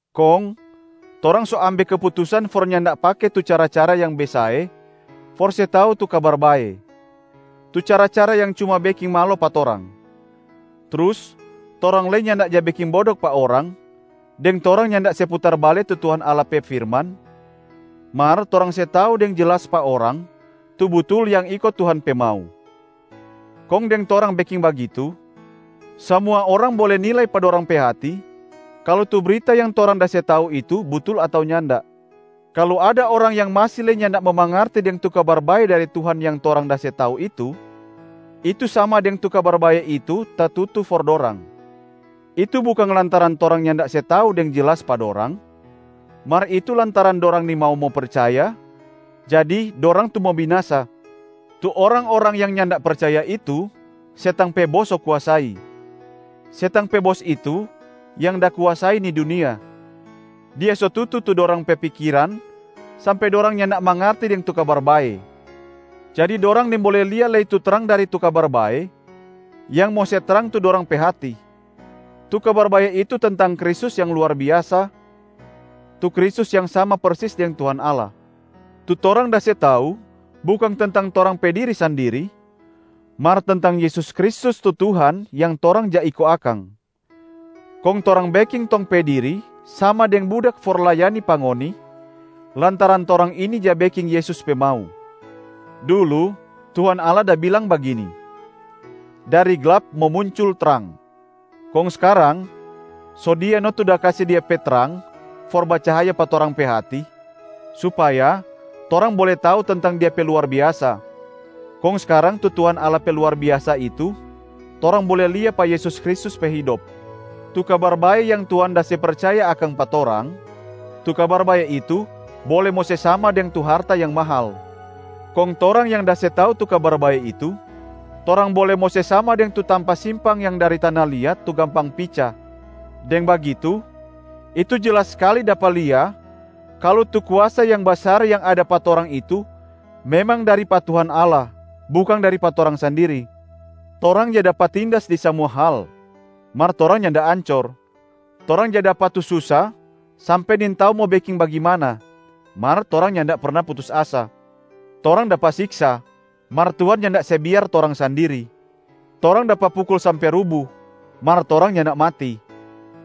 Kong torang so ambe keputusan for nyanda pake tu cara-cara yang besae for se tau tu Kabar Bae, tu cara-cara yang cuma beking malo pa torang. Trus torang lei nyanda ja beking bodok pa orang deng torang nyanda se putar bale tu Tuhan Allah pe firman, mar torang se tau deng jelas pa orang tu butul yang iko Tuhan pe mau. Kong deng torang beking bagitu, samua orang bole nilai pa dorang pe hati kalu tu brita yang torang da se tau itu butul ato nyanda. Kalu ada orang yang masi lei nyanda mo mangarti deng tu Kabar Bae dari Tuhan yang torang da se tau itu, itu sama deng tu Kabar Bae itu tatutu for dorang. Itu bukang lantaran torang nyanda se tau deng jelas pa dorang, mar itu lantaran dorang nimau mo percaya jadi dorang tu mo binasa. Tu orang-orang yang nyanda percaya itu, setang pe bos so kuasai. Setang pe bos itu yang da kuasai ni dunia. Dia so tutu tu dorang pe pikiran sampe dorang nyanda mangarti deng tu Kabar bae, jadi dorang nimbole lia lei tu trang dari tu Kabar Bae yang mo se trang tu dorang pe hati. Tu Kabar Bae itu tentang Kristus yang luar biasa, tu Kristus yang sama persis deng Tuhan Allah. Tu torang da se tau bukang tentang torang pe diri sandiri mar tentang Yesus Kristus tu Tuhan yang torang ja iko akang. Kong torang beking tong pe diri sama deng budak for layani pa ngoni, lantaran torang ini ja beking Yesus pe mau. Dulu Tuhan Allah da bilang bagini, “Dari glap mo muncul trang!” Kong skarang so Dia no tu da kase Dia pe trang for bacahaya pa torang pe hati, supaya torang bole tau tentang Dia pe luar biasa. Kong skarang tu Tuhan Allah pe luar biasa itu, torang bole lia pa Yesus Kristus pe hidop. Tu Kabar Bae yang Tuhan da se percaya akang pa torang, tu Kabar Bae itu bole mo se sama deng tu harta yang mahal. Kong torang yang da se tau tu Kabar Bae itu, torang bole mo se sama deng tu tampa simpang yang dari tana liat tu gampang pica. Deng bagitu, itu jelas skali dapa lia kalu tu kuasa yang basar yang ada pa torang itu memang dari pa Tuhan Allah, bukang dari pa torang sandiri. Torang ja dapa tindas di samua hal, mar torang nyanda ancor. Torang ja dapa tu susa sampe nintau mo beking bagimana, mar torang nyanda perna putus asa. Torang dapa siksa, mar Tuhan nyanda se biar torang sandiri. Torang dapa pukul sampe rubu, mar torang nyanda mati.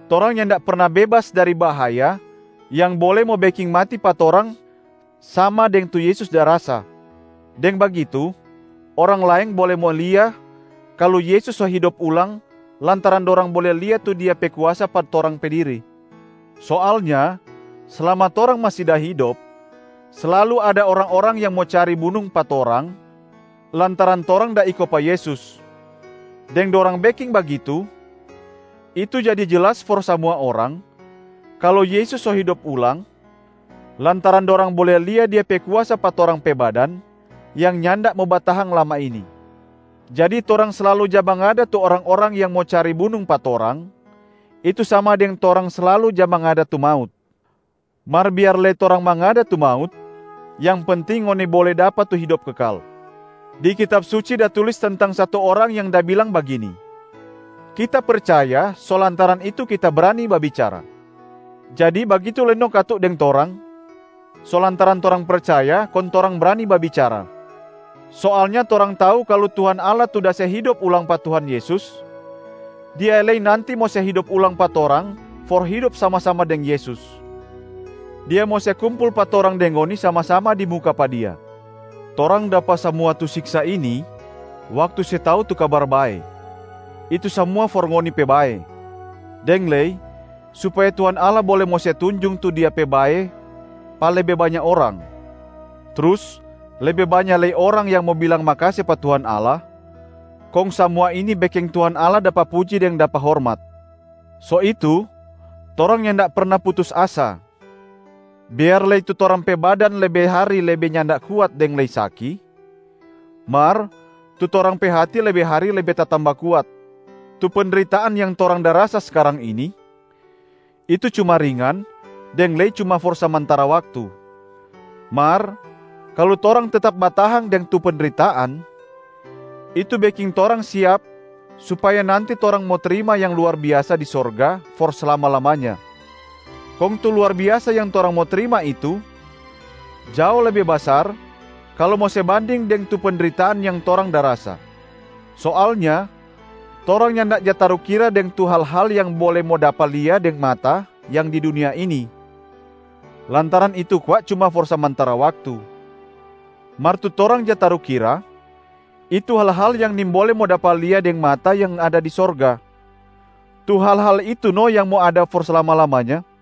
Torang nyanda perna bebas dari bahaya yang bole mo beking mati pa torang sama deng tu Yesus da rasa, deng bagitu orang laeng bole mo lia kalu Yesus so hidop ulang lantaran dorang bole lia tu Dia pe kuasa pa torang pe diri. Soalnya slama torang masi da hidop, slalu ada orang-orang yang mo cari bunung pa torang lantaran torang da iko pa Yesus. Deng dorang beking bagitu, itu jadi jelas for samua orang kalu Yesus so hidop ulang, lantaran dorang bole lia Dia pe kuasa pa torang pe badan yang nyanda mo batahang lama ini. Jadi torang slalu ja mangada tu orang-orang yang mo cari bunung pa torang, itu sama deng torang slalu ja mangada tu maut. Mar biar lei torang mangada tu maut, yang penting ngoni bole dapa tu hidop kekal. Di Kitab Suci da tulis tentang satu orang yang da bilang bagini, “Kita percaya, so lantaran itu kita brani babicara”. Jadi bagitu lei no katu deng torang, so lantaran torang percaya kong torang brani babicara. Soalnya torang tau kalu Tuhan Allah tu da se hidop ulang pa Tuhan Yesus, Dia lei nanti mo se hidop ulang pa torang for hidop sama-sama deng Yesus. Dia mo se kumpul pa torang deng ngoni sama-sama di muka pa Dia. Torang dapa samua tu siksa ini waktu se tau tu Kabar Bae, itu samua for ngoni pe bae, deng lei supaya Tuhan Allah bole mo se tunjung tu Dia pe bae pa lebe banya orang, trus lebe banya lei orang yang mo bilang makase pa Tuhan Allah, kong samua ini beking Tuhan Allah dapa puji deng dapa hormat. So itu torang nyanda perna putus asa, biar lei tu torang pe badan lebe hari lebe nyanda kuat deng lei saki, mar tu torang pe hati lebe hari lebe tatamba kuat. Tu pendritaan yang torang da rasa skarang ini, itu cuma ringan deng lei cuma for samantara waktu. Mar kalu torang tetap batahang deng tu pendritaan, itu beking torang siap supaya nanti torang mo trima yang luar biasa di sorga for slama-lamanya. Kong tu luar biasa yang torang mo trima itu jao lebe basar kalu mo se banding deng tu pendritaan yang torang da rasa. Soalnya torang nyanda ja tarukira deng tu hal-hal yang bole mo dapa lia deng mata yang di dunia ini, lantaran itu kwa cuma for samantara waktu. Mar tu torang ja tarukira, itu hal-hal yang nimbole mo dapa lia deng mata yang ada di sorga, tu hal-hal itu no yang mo ada for slama-lamanya.